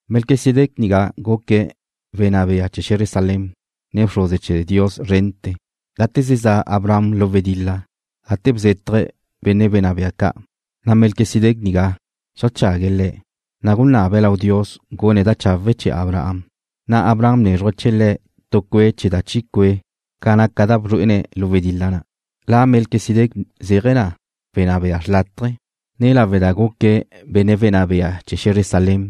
Melquisedec nigá guque̱' wenná bea chee̱ xe̱zre Salem, ne bxruze chee̱ Dios szrente̱. Gate ze za' Abraham lu wedil-la gate bzétaje̱' benne' wenná bea ca', na' Melquisedec nigá xeajchague̱' le̱', ne gunabe̱' lau Dios gune̱' da chawe' chee̱ Abraham, na' Abraham bnézruje̱' chee̱ le̱' tu cue' chee̱ da chi cue' ca' ca naca da bzrué'ene̱' lu wedil-la na'. La Melquisedec zéaje̱ na wenná bea xlátaje̱, ne lawe' da guque̱' benne' wenná bea chee̱ xe̱zre Salem,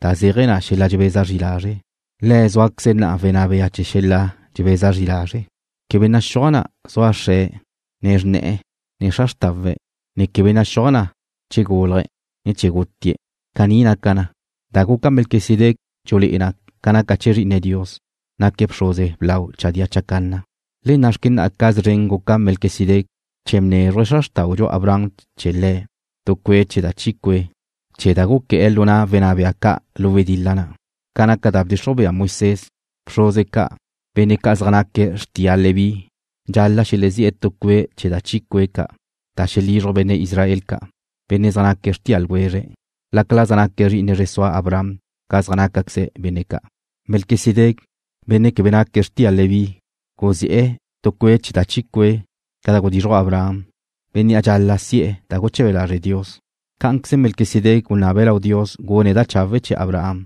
da zéaje̱ na xel-la' dxebeza zri lazre', le̱' zéaje̱queze na wenná bea chee̱ xel-la' dxebeza zri lazre'. Quebe naxúaj na zua xre̱', ne xrne̱'e̱, ne xra xrtawe̱', ne quebe naxúaj na che gúlaje̱', ne che gutie̱'. Caní naca na, da guca Melquisedec dxulé'e na ca naca chee̱ Zri'ine Dios, naque̱' bxruze blau chadía chacanna. Le na' xque na'a ca szren guca Melquisedec, che bnezruj xra xrtáudxu Abraham chee̱ le̱' tu cue' chee̱ da chi cue' chee̱ da guqué̱'e̱ lu na' wenná bea ca' lu wedil-la na'. Ca naca da bdxixruj bea Moisés, bxruze ca', benne' ca' zaj naque̱' xrtia Leví dxal-la' xelezí'e̱ tu cue' chee̱ da chi cue' ca' da xelizruj benne' Israel ca', benne' zaj naque̱' xrtia ljwezre̱', lácala zaj naque̱' zri'ine zre sua Abraham ca zaj nácaqueze benne' ca'. Melquisedec, benne' quebe naque̱' xrtia Leví guzi'e̱ tu cue' chee̱ da chi cue' ca' da gudizruj Abraham, bénnea' dxal-la' si'e̱ da guche̱be lazre' Dios. Cá'anqueze Melquisedec gunabe̱' lau Dios gune̱' da chawe' chee̱ Abraham,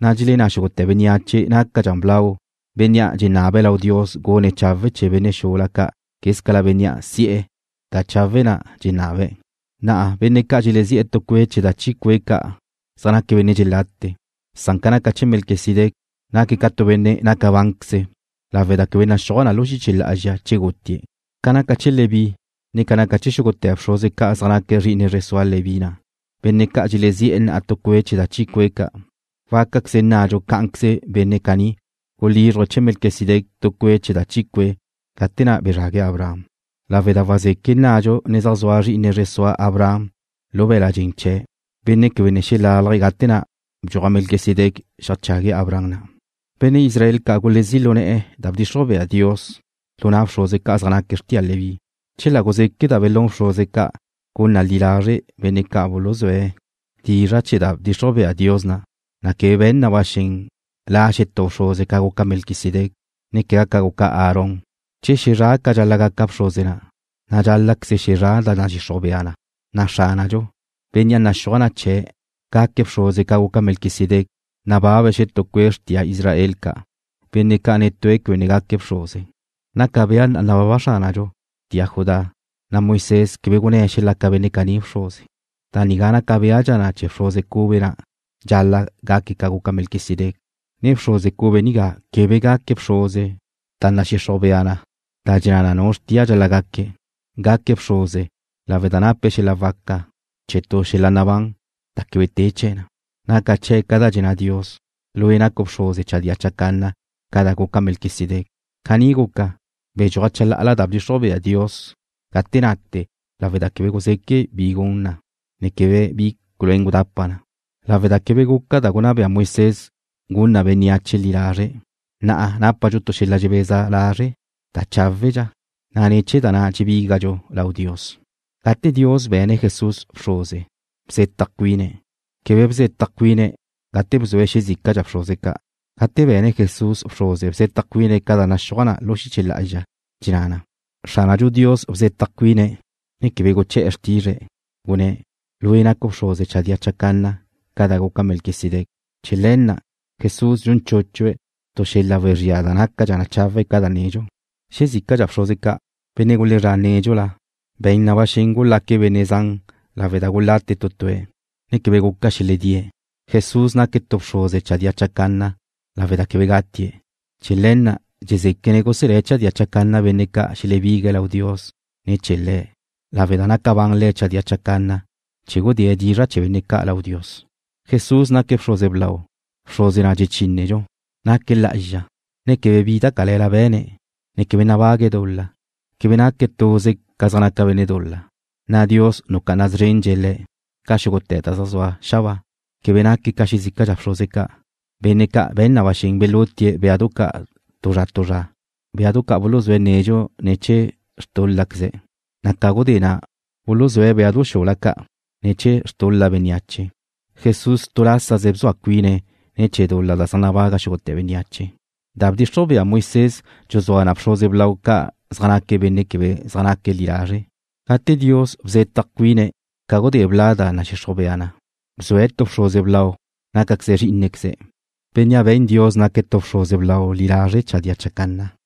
na' dxelenná xúgute̱ bénneache nácadxa blau bénnea' dxenabe̱' lau Dios gune̱' chawe' chee̱ benne' xula ca' quézcala bénnea' si'e̱ da chawe' na' dxenabe̱'. Na'a benne' ca' dxelezi'e̱ tu cue' chee̱ da chi cue' ca' zaj naque̱' benne' dxelate, san ca naca chee̱ Melquisedec, naque̱' ca tu benne' naca bánqueze̱' lawe' da quebe naxúaj na lu xiche lá'azxa che gutie̱'. Ca naca chee̱ Leví, ne ca naca chee̱ xúgute̱ bxruze ca' zaj naque̱' zri'ine zre sua Leví na', benne' ca' dxelezí'e̱ na'a tu cue' chee̱ da chi cue' ca', wácaqueze nnadxu cá'anqueze benne' caní gulízruje̱' chee̱ Melquisedec tu cue' chee̱ da chi cue' gate na' bezrague̱' Abraham, lawe' da wazeque' nnadxu ne zaj zua zri'ine zre sua Abraham lu be̱l-la' dxen chee̱', benne' quebe ne xelalaj gate na' bdxuaj Melquisedec xeajchague̱' Abraham na'. Benne' Israel ca' gulezí' lu ne̱'e̱ da bdxixruj bea Dios lu na' bxruze ca' zaj naque̱' xrtia Leví. Chela guzeque' da belún bxruze ca' gun na li lazre' benne' ca' buluzúe̱' dizra' chee̱ da bdxixruj bea Dios na', na' quebe be̱n na ba xen la' xetú bxruze ca guca Melquisedec, ne quegá ca guca Aarón. Che xezrá' ca dxal-la' gaca bxruze na', na' dxál-la'queze xezrá' da nadxixruj bea na'. Xránadxu, Bénnea' naxúaj na chee̱' gaque̱' bxruze ca guca Melquisedec, nababe̱' xetú cue' xrtia Israel ca', benne' ca' netue̱' quebe ne gaque̱' bxruze. Naca bea na nababa Xránadxu xrtia Judá, na' Moisés quebe gunné̱' xelaca benne' caní bxruze. Da nigá naca béadxa na che bxruze cube na' dxal-la' gaque̱' ca guca Melquisedec, ne bxruze cube nigá quebe gaque̱' bxruze ne̱ chee̱ tu da nadxixruj bea da dxenná na nu xrtia dxal-la' gaque̱'. Gaque̱' bxruze lawe' da nape̱' xel-la' waca chee̱ tu xel-la' nabán da quebe te chee̱ na. Naca chee̱' ca da dxenná Dios: Lue' nacu' bxruze chadía chacanna ca da guca Melquisedec. Caní guca, bedxúaj chalá'ala da bdxixruj bea Dios gate nate lawe' da quebe guzeque' bi gun na, ne quebe bi culuén gudapa na, lawe' da quebe guca da gunná bea Moisés gun na bénneache li lazre'. Na'a nápadxu tu xel-la' dxebeza lazre' da cháwedxa, na' ne̱ chee̱ na dxebígadxu lau Dios. Gate Dios be̱ne̱' Jesús bxruze, bzetaj cuine̱'. Quebe bzetaj cuine̱' gate bzue̱' xezícadxa bxruze ca'. Gate be̱ne̱' Jesús bxruze bzetaj cuine̱' ca da naxúaj na lu xiche lá'azxa, dxenná na: Xránadxu Dios bzetaj cuine̱', ne quebe guché̱'e̱ xrtizre̱'. Gunné̱': “Lue' nacu' bxruze chadía chacanna ca da guca Melquisedec.” Chee̱ le̱ na' Jesús dxun chúchue̱' tu xel-la' wezría da nácadxa chawe' ca da nedxu. Xezícadxa bxruze ca', benne' gulezrá' nédxula be̱n na ba xen gulaque̱' benne' zan lawe' da gulate tu tue̱', na' quebe guca xeledíe̱'. Jesús naque̱' tu bxruze chadía chacanna lawe' da quebe gatie̱'. Chee̱ le̱ na' dxezéquene̱' guselé̱' chadía chacanna benne' ca' xelebigue̱' lau Dios ne̱ chee̱ Le̱', lawe' da naca ban Le̱' chadía chacanna chee̱ gudée̱' dizra' chee̱ benne' ca' lau Dios. Jesús naque̱' bxruze blau, bxruze na' dxechínedxu. Naque̱' lá'azxa, ne quebe bi da cale̱la be̱ne̱', ne quebe nabague̱' dul-la. Quebe naque̱' tuze ca zaj naca benne' dul-la, na' Dios nucá'ana szrendxe̱' Le̱' ca xúgute̱ da zaj zua xabáa. Quebe naque̱' ca xezícadxa bxruze ca', benne' ca' be̱n na ba xen belutie̱' béadu ca' tu zra tu zra, béadu ca' buluzúe̱' nedxu ne̱ chee̱ xtúl-laqueze̱', na' ca gudé na' buluzúe̱' béadu xula ca' ne̱ chee̱ xtul-la bénneache. Jesús tu lásaze bzua cuine̱' ne̱ chee̱ dul-la zaj nabaga xúgute̱ bénneache. Da bdxixruj bea Moisés dxuzúa na bxruze blau ca' zaj naque̱' benne' quebe zaj naque̱' li lazre'. Gate Dios bzetaj cuine̱' ca gudé bla' da nadxixruj bea na', bzue̱' tu bxruze blau naque̱' Zrí'inequeze̱', Bénnea' be̱n Dios naque̱' tu bxruze blau li lazre' chadía chacanna.